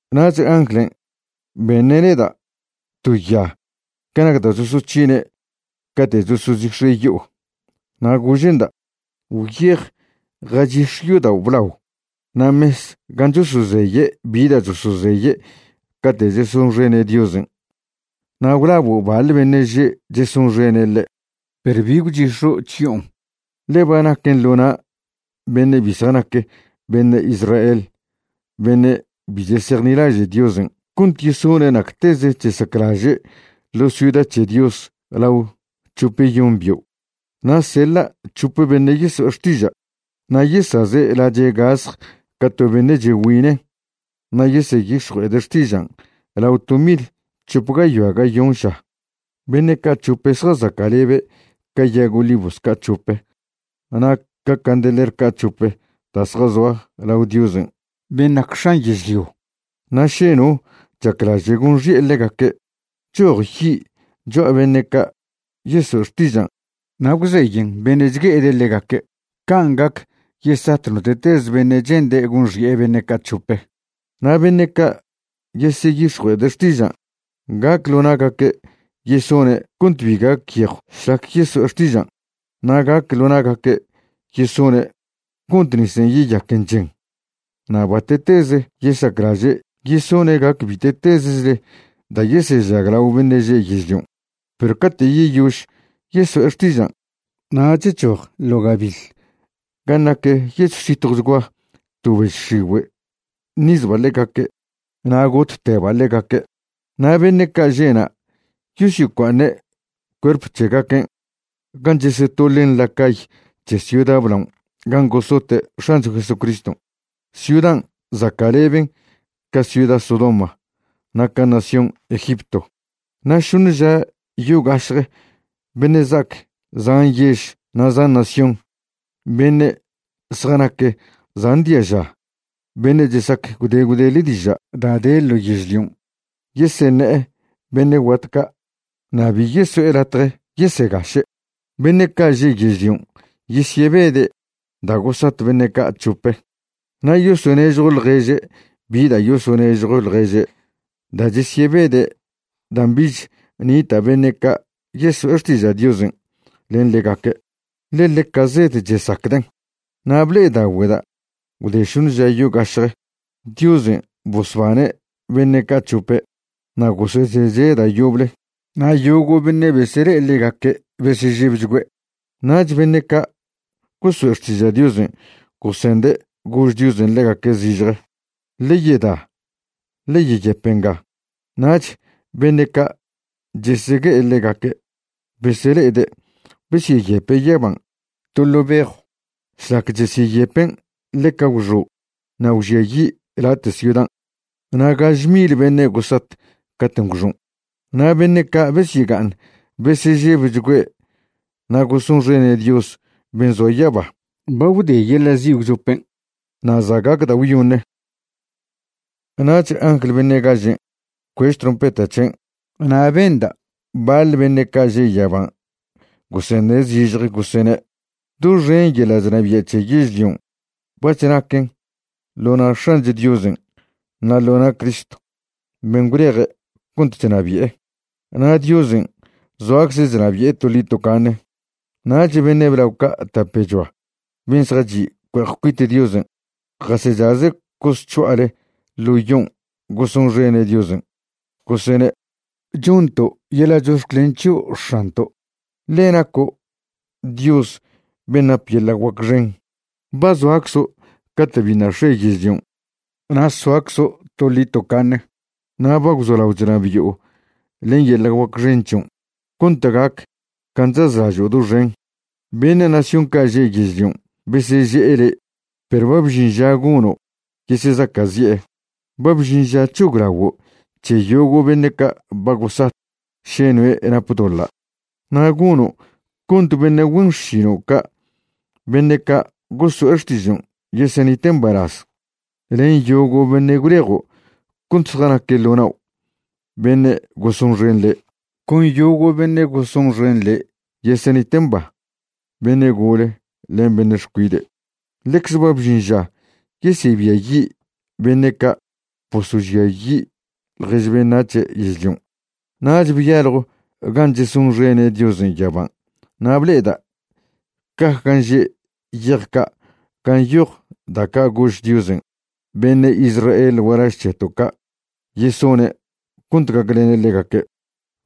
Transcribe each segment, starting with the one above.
Nach anglen' beṉe' neda' to ya ca nac da' chosoc̱hine' cate' chosochix̱e' yo'o, na' gože'nda': ―Gwyej jachix̱e yodao' blao na' mes gan' chosozeye' bi da' chosozeye' cate' chesonxene' Diosen', na' gwlabo' baḻ beṉe' že' chesonxene' ḻe'. Perw bi gwchix̱o' chyo'on, ḻe ba naquen ḻo na' beṉe' bi zjanac beṉe' Israel beṉe' bi chesejnilaže' Diosen' cont yesone' nacteze chesaclaže' ḻo ciuda c̱he Dios lao c̱hopeyon bio'. Na' seḻa' c̱hope beṉe' yeso'e xtiža', na' yesaze' lache' gasj ca to beṉe' chegüine' na' yeseyix̱jue'ede' xtižan' lao to mil c̱hop gayoa gayon ža. Beṉe' ca' c̱hope zjazaca'lebe' ca yag olivos ca' c̱hope na' ca candeler ca' c̱hope da' zjazoa lao Diosen' ben' nac X̱an yežlio. Na' še no chaclaže' gonxi'e ḻegaque', choj yi' cho'a beṉe' ca' yeso'e xtižan' na' gwzeyen beṉe' chgue'ede' ḻegaque'. Can' gac yesat note'teze beṉe' chende' gonxi'e beṉe' ca' c̱hope. Na' beṉe' ca' yeseyix̱jue'ede' xtižan', gac ḻo na'gaque' yesone' cont bi gac yejw šlac yeso'e xtižan', na' gac ḻo na'gaque' yesone' cont nisen' yeyaquen chen, na' bate'teze yesaclaže', yesone' gac bite'tezechle da' yesežaglao beṉe' že' yežlion'. Perw cate' yeyož yeso'e xtižan', nach choj ḻo' gabiḻ gan' nac yechw zitjwchgua to bež x̱igüe' ṉizba' ḻegaque' na' gotteba' ḻegaque'. Na' beṉe' ca' že'na' yosyocua'aṉe' cuerp c̱hegaquen' gan' chesetoḻen ḻa cay c̱he ciuda blaon' gan' gosote' X̱ancho Jesucriston'. Ciudan' zaca'leben ca ciuda Sodoma na' ca nación Egipto. Na' šoṉe ža yo gašje beṉe' za'ac zan yež na' zan nación, beṉe' zjanac zan diaža, beṉe' chesac gwde gwdele diža' da' de ḻo yežlion', yeseṉe'e beṉe' guat ca' na' bi yeso'e latje yesegaše'. Beṉe' ca' že' yežlion' yesyebede' da' gosat beṉe' ca' c̱hope, na' yosonežjo ḻježe' bi da' yosonežjo ḻježe' da' chesyebede' dan' bich nita' beṉe' ca' yeso'e xtiža' Diosen' len ḻegaque', ḻe ḻeca zed chesacden'. Na' ble'edaogüeda' gwde šoṉe ža yogašje Diosen' bosbane' beṉe' ca' c̱hope na' gosezeche' da' yoble. Na' yogo' beṉe' besele'e ḻegaque' besežebchgüe'. Nach beṉe' ca' gosoe' xtiža' Diosen' gosende' gož Diosen' ḻegaque' zižje: ―Ḻe yeda, ḻe yeyep nga. Nach beṉe' ca' chesegue'e ḻegaque' besele'ede' besyeyepe' yaban' to ḻo' bejw. Šlac chesyeyepen' ḻeca gwxo' na' gwžiayi' late' ciudan', na' gaže mil beṉe' gosat caten' gwxon'. Na' beṉe' ca' besyega'aṉ besežebchgüe' na' gosonxene' Dios ben' zoa yaba. Ba gwde yeḻa' zi' gwchopen' na' za' gac da' gwyoṉe. Nach angl beṉe' gažen' bcuež trompeta c̱hen' na' benda' baḻ beṉe' ca' že' yaban' goseṉe' zižje, gosene': Doxen yeḻa' chnabia' c̱he yežlion' bac̱h naquen ḻo na' X̱ancho Diosen' na' ḻo na' Cristo ben' gwleje' cont chnabi'e. Na' Diosen' zoacze' chnabi'e toḻi tocaṉe. Nach beṉe' blao ca' tapechoa ben' zjachi' cue'ej cuit Diosen', jasechaze' cosc̱ho'ale ḻo yon' gosonxene' Diosen', gosene': Chonto' yeḻa' chox̱clen c̱hio' X̱anto', ḻe naco' Dios ben' nap yeḻa' guac xen. Ba zoaczo' cate' biṉa' x̱e yežlion', na' soaczo' toḻi tocaṉe. Na' ba gwzolao chnabi'o len yeḻa' guac xen c̱hion' cont gac can' chazlažo' doxen. Beṉe' nación ca' že' yežlion' beseže'e le', perw ba bžin ža gono' yesezaca'zi'e. Ba bžin ža c̱hoglaguo' c̱he yogo' beṉe' ca' ba gosat še noe' nap doḻa'. Na' gono' cont beṉe' güen xšino' ca' beṉe' ca' goso'e xtižon' yesenite' mbalaz, len yogo' beṉe' gwlejo' cont zjanaque' ḻo nao', beṉe' gosonxen le'. Con yogo' beṉe' gosonxen le' yesenite' mba, beṉe' gole len beṉe' xcuide'. Ḻecze ba bžin ža yesebiayi' beṉe' ca' bosožiayi' ḻjež beṉac̱he' yežlion'. Nach byaljo gan' chesonxene' Diosen' yaban' na' ble'eda' caj gan' že' yej ca' gan' nyoj da' ca' gož Diosen' beṉe' Israel gualaž c̱heto' ca' yesone' cont gaclene' ḻegaque'.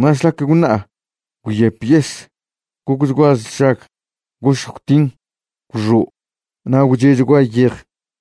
Na' šlac gwṉa'a, gwyep yes, gocchgua sšag, gošj gwtin, gwxo' na' gwche'chgua yej.